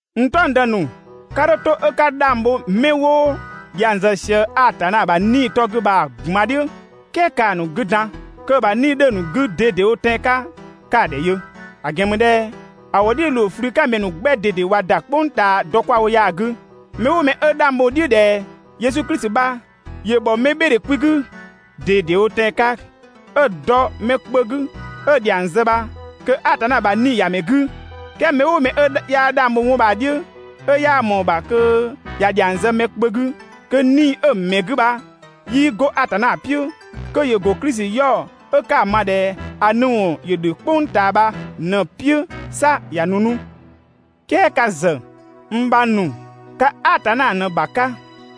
N "taɔngdë ‑nu, 'ka 'dho 'to 'ö ka 'dhang bho 'mɛ 'wo dhiang zë Atanna ‑bha 'Nii‑ 'tɔ 'gü bha‑ ꞊gban "dhiʋ̈, "kɛɛ ‑kaa ‑nu 'gü dan kö‑ ‑bha 'Nii‑ 'dhö‑ ‑nu 'gü ꞊dede wo tɛan‑ 'ka 'ka‑ ‑dhɛ yö. ‑A ‑gɛn ‑mü ꞊dhɛ ‑a ‑wʋ "dhiʋ̈ ‑loo ꞊flü 'ka ‑mɛ ‑nu 'gbɛ ꞊dede ꞊wa ‑da "kpʋng ꞊taa dɔ 'kwa‑ wo ya‑ 'gü. Mɛ "ʋʋ mɛ 'ö 'dhang bho‑ "dhiʋ̈ ꞊dhɛ Yesu Klisi bha ‑yö ‑bhɔ mɛbhɩɩdhe kwi 'gü ꞊dedewo tɛan‑ 'ka, 'ö dɔ mɛ kpö 'gü 'ö‑ ‑dhiang zë bha kö Atanna ‑bha 'Nii‑ ‑ya ‑mɛ 'gü. "Kɛɛ mɛ "ʋʋ mɛ 'ö 'yaa 'dhang bho 'wɔn bha‑ "dhiʋ̈, 'ö 'yaa ꞊mɔɔ‑ ‑bha kö ‑ya ‑dhiang zë mɛ kpö 'gü, kö 'Nii‑ 'ö‑ ‑mɛ 'gü bha 'yii 'go Atanna "piʋ̈. Kö ‑yö ‑go Klisi 'yaɔ‑ 'ö 'ka‑ ma ꞊dhɛ ‑a nu ‑wɔn ‑dhö "kpʋng ꞊taa bha ꞊në‑ "piʋ̈, 'sa ꞊ya nu 'nu. "Kɛɛ ka ‑zë, n bhang ‑nu, ka Atanna ꞊në‑ ‑bha 'ka,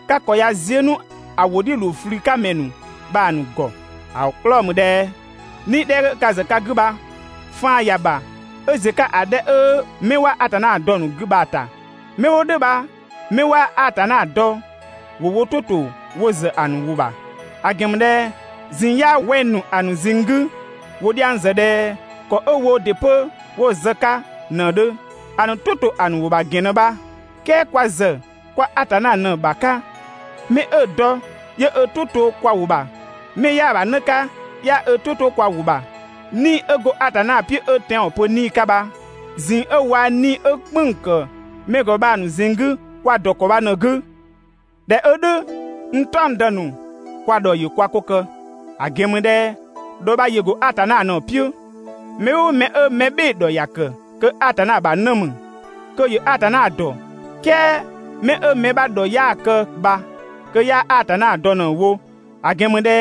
ka ‑kɔ ꞊ya ziö 'nu ‑a ‑wʋ "dhiʋ̈ ‑loo ꞊flü 'ka ‑mɛ ‑nu bha‑ ‑nu ‑gɔ. ‑A 'klɔɔ‑ ‑mü ꞊dhɛ 'Nii‑ 'dhɛ 'ö ka ‑zë ka 'gü bha, faan ‑ya ‑bha 'ö ‑ziö 'ka ‑a 'dhɛ 'ö 'mɛ 'waa Atanna dɔ‑ ‑nu 'gü bha‑ ‑ta. 'Mɛ 'wo "dhʋ̈ bha 'mɛ 'waa Atanna dɔ ‑wo wo "tʋ ‑to wo ‑zë ‑a ‑nu ‑wʋ ‑bha. ‑A ‑gɛn ‑mü ꞊dhɛ ꞊zinng 'yaa wɛng‑ ‑nu ‑a ‑nu ꞊zinng 'gü, ‑wo dhiang ‑zë ꞊dhɛ ‑kɔ 'ö woo ‑dɩ 'pö 'wo‑ zë‑ 'ka ꞊në‑ 'dhö. ‑A ‑nu "tʋ ‑to ‑a ‑nu ‑wʋ ‑bha ‑gɛn ꞊në bha. "Kɛɛ kwa ‑zë kwa Atanna ꞊në‑ ‑bha 'ka. 'Mɛ 'ö‑ dɔ 'yö ö "tʋ 'to kwa ‑wʋ ‑bha, 'mɛ 'yaa‑ ‑bha 'në 'ka 'yaa ö "tʋ 'to kwa ‑wʋ ‑bha. 'Nii‑ 'ö go Atanna "piʋ̈ 'ö tɛanwɔn pö 'Nii‑ 'ka bha, ꞊zinng 'ö waa‑ 'nii‑ 'ö "kpënng‑ ‑kë mɛ ‑gɔ bha‑ ‑nu ꞊zinng 'gü kwa‑ ‑dɔ ‑kɔ bha ꞊në‑ 'gü. ꞊Dhɛ 'ö "dhʋ̈, n "taɔngdë ‑nu, kwa ‑dhɔ ‑yö kwa 'ko kë. ‑A ‑gɛn ‑mü ꞊dhɛ ‑dhɔ bha ‑yö ‑go Atanna ꞊në‑ "piʋ̈. Mɛ "ʋʋ mɛ 'ö mɛ "bhɩɩ‑ ‑dhɔ ‑ya ‑kë kö Atanna ‑bha 'në ‑mü, kö ‑yö Atanna ‑dɔ. "Kɛɛ 'mɛ 'ö mɛ 'bha ‑dhɔ 'yaa‑ kë bha kö 'yaa Atanna dɔ ꞊në‑ wo. ‑A ‑gɛn ‑mü ꞊dhɛ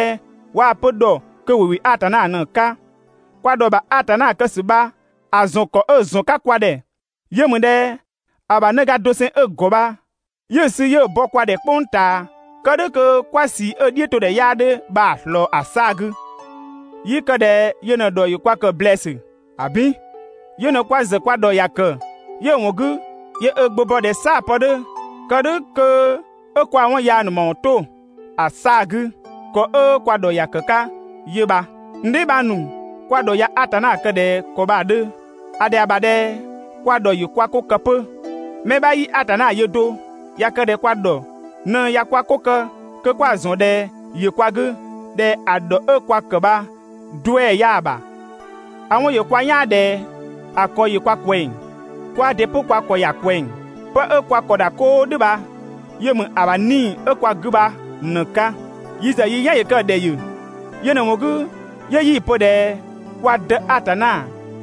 waa‑ pö ‑dhɔ, kö ‑wo ‑wɩ Atanna ꞊në‑ 'ka. Kwa ‑dhɔ ‑bha Atanna kë ‑sü bha‑ ‑zɔn ‑kɔ 'ö‑ ‑zɔn 'ka kwa ‑dhɛ yö ‑mü ꞊dhɛ ‑a ‑bha 'në ga doseng 'ö‑ ‑gɔ bha 'yö‑ sü 'yö‑ bɔ kwa ‑dhɛ "kpʋng ꞊taa, kë "dhʋ̈ kö 'kwa ꞊sii 'ö‑ "dhiʋ̈todhɛ 'yaa 'dhö bha‑ ꞊slɔɔ ‑a 'saa‑ 'gü. 'Yii kë ꞊dhɛ yö ꞊në‑ ‑dhɔ ‑yö kwa ‑kë ‑blɛɛsü. ‑Abin! Yö ꞊në kwa ‑zë kwa ‑dhɔ ‑ya ‑kë, 'yö‑ ‑wɔn 'gü 'yö ö Gbö bɔ ꞊dhɛ "saa‑ pë 'dhö kë "dhʋ̈ kö 'ö kwaa‑ 'wɔn yaa ‑nu ‑mawɔn 'to ‑a 'saa‑ 'gü. ‑Kɔ 'ö kwa ‑dhɔ ‑ya ‑kë 'ka 'yö bha. N dheebhang ‑nu, kwa ‑dhɔ ꞊ya Atanna kë ꞊dhɛ ‑kɔ bha‑ 'dhö, ‑a ‑dhɛa ‑bha ꞊dhɛ kwa ‑dhɔ ‑yö kwa 'ko kë 'pö. Mɛ 'bha 'yii Atanna yö do. ꞊Ya kë ꞊dhɛ kwa ‑dhɔ ꞊në ꞊ya kwa 'ko kë kö 'kwa‑ ‑zɔn ꞊dhɛ ‑yö kwa 'gü, ꞊dhɛ ‑a ‑dhɔ 'ö kwa ‑kë bha 'duɛ‑ 'yaa‑ ‑bha. ‑A 'wɔn ‑yö kwa "yaan ꞊dhɛ ‑a ‑kɔ ‑yö kwa ꞊kwɛng, kwaa ‑dɩ 'pö kwa ‑kɔ ‑ya ꞊kwɛng. 'Pë 'ö kwa ‑kɔ ‑da 'koo "dhʋ̈ bha yö ‑mü ‑a ‑bha 'Nii‑ 'ö‑ ‑ya kwa 'gü bha ꞊në‑ 'ka. Yi ‑zë yi "yan ‑yö kë‑ ‑dhɛ ‑yö. Yö ꞊në‑ ‑wɔn 'gü 'yö 'yi‑ pö ꞊dhɛ kwa Dë Atanna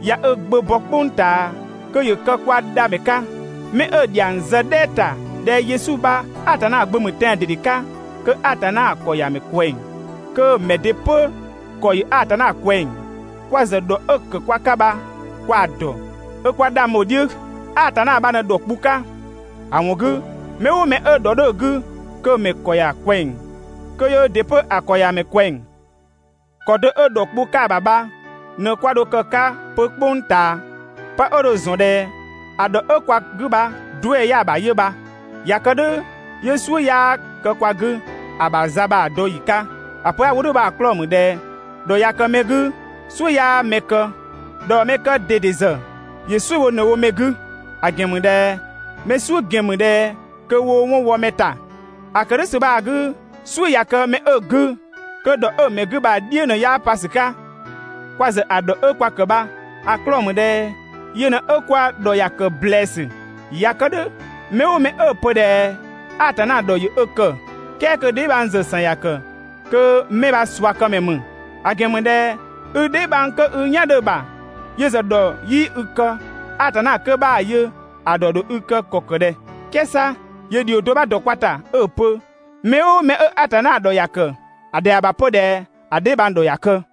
꞊ya ö Gbö bɔ "kpʋng ꞊taa kö ‑yö kë kwa Dhamɛ 'ka. 'Mɛ 'ö‑ ‑dhiang zë "dhɛɛ ‑ta ꞊dhɛ Yesu bha Atanna Gbö ‑mü tɛan‑ ꞊dede 'ka, kö Atanna ‑kɔ ‑ya ‑mɛ ꞊kwɛng, kö‑ ‑mɛ ‑dɩ 'pö‑ ‑kɔ ‑yö Atanna ꞊kwɛng. Kwa ‑zë ‑dhɔ 'ö‑ ‑kë kwa 'ka bha kwa‑ ‑dɔ, 'ö 'kwa 'dhang bho‑ "dhiʋ̈. Atanna bha ꞊në ‑dhɔ kpu 'ka, ‑a ‑wɔn 'gü mɛ "ʋʋ mɛ 'ö ‑dhɔ 'dhö‑ 'gü, kö‑ ‑mɛ ‑kɔ ‑ya ꞊kwɛng, kö yöö ‑dɩ 'pö‑ ‑kɔ ‑ya ‑mɛ ꞊kwɛng. ‑Kɔ do 'ö ‑dhɔ kpu 'ka‑ ‑bha bha ꞊në 'kwa dho kë‑ 'ka 'pö "kpʋng ꞊taa, 'pë 'ö dho‑ ‑zɔn ꞊dhɛ ‑a ‑dhɔ 'ö kwa 'gü bha 'duɛ‑ 'yaa‑ ‑bha 'yö bha. ꞊Ya kë "dhʋ̈ 'yö "suʋ̈ 'yaa kë kwa 'gü ‑a ‑bha za bha‑ dɔ ‑yi 'ka. ‑A pö 'a‑ wo "dhʋ̈ bha‑ 'klɔɔ‑ ‑mü ꞊dhɛ ‑dhɔ ꞊ya kë mɛ 'gü "suʋ̈ 'yaa mɛ kë, dhaɔmɛkë ꞊dede ‑zë ‑yö "suʋ̈ bho ꞊në‑ wo mɛ 'gü. ‑A ‑gɛn ‑mü ꞊dhɛ mɛ "suʋ̈ ‑gɛn ‑mü ꞊dhɛ kö woo 'wɔn wɔ mɛ ‑ta. ‑A ‑kë "dhʋ̈ ‑sü bha‑ 'gü, "suʋ̈ ꞊ya kë mɛ 'ö‑ 'gü kö ‑dhɔ 'ö‑ mɛ 'gü bha‑ "dhiʋ̈ ꞊në 'yaa pa ‑sü 'ka. Kwa ‑zë ‑a ‑dhɔ 'ö kwa ‑kë bha‑ 'klɔɔ‑ ‑mü ꞊dhɛ yö ꞊në kwa ‑dhɔ ‑ya ‑kë ‑blɛɛsü. ꞊Ya kë "dhʋ̈, mɛ "ʋʋ mɛ 'ö‑ pö ꞊dhɛ Atanna ‑dhɔ ‑yö ö ‑kë, "kɛɛ kö‑ dheebhang ‑zë ‑san ‑ya ‑kë, kö 'mɛ bha ꞊suakëmɛ ‑mü; ‑a ‑gɛn ‑mü ꞊dhɛ i dheebhang kö i "yan 'dhö‑ ‑bha yö ‑zë ‑dhɔ 'yii i kë, Atanna 'kö 'bhaa‑ yö ‑a ‑dhɔ ‑dho i kë ‑kɔ ‑kë ꞊dhɛ? "Kɛɛ 'sa ‑yö ‑dhio do 'bha ‑dɔ kwa ‑ta 'ö‑ pö: «Mɛ "ʋʋ mɛ 'ö Atanna ‑dhɔ ‑ya ‑kë, ‑a ‑dhɛa ‑bha 'pö ꞊dhɛ ‑a dheebhang ‑dhɔ ‑ya kë.»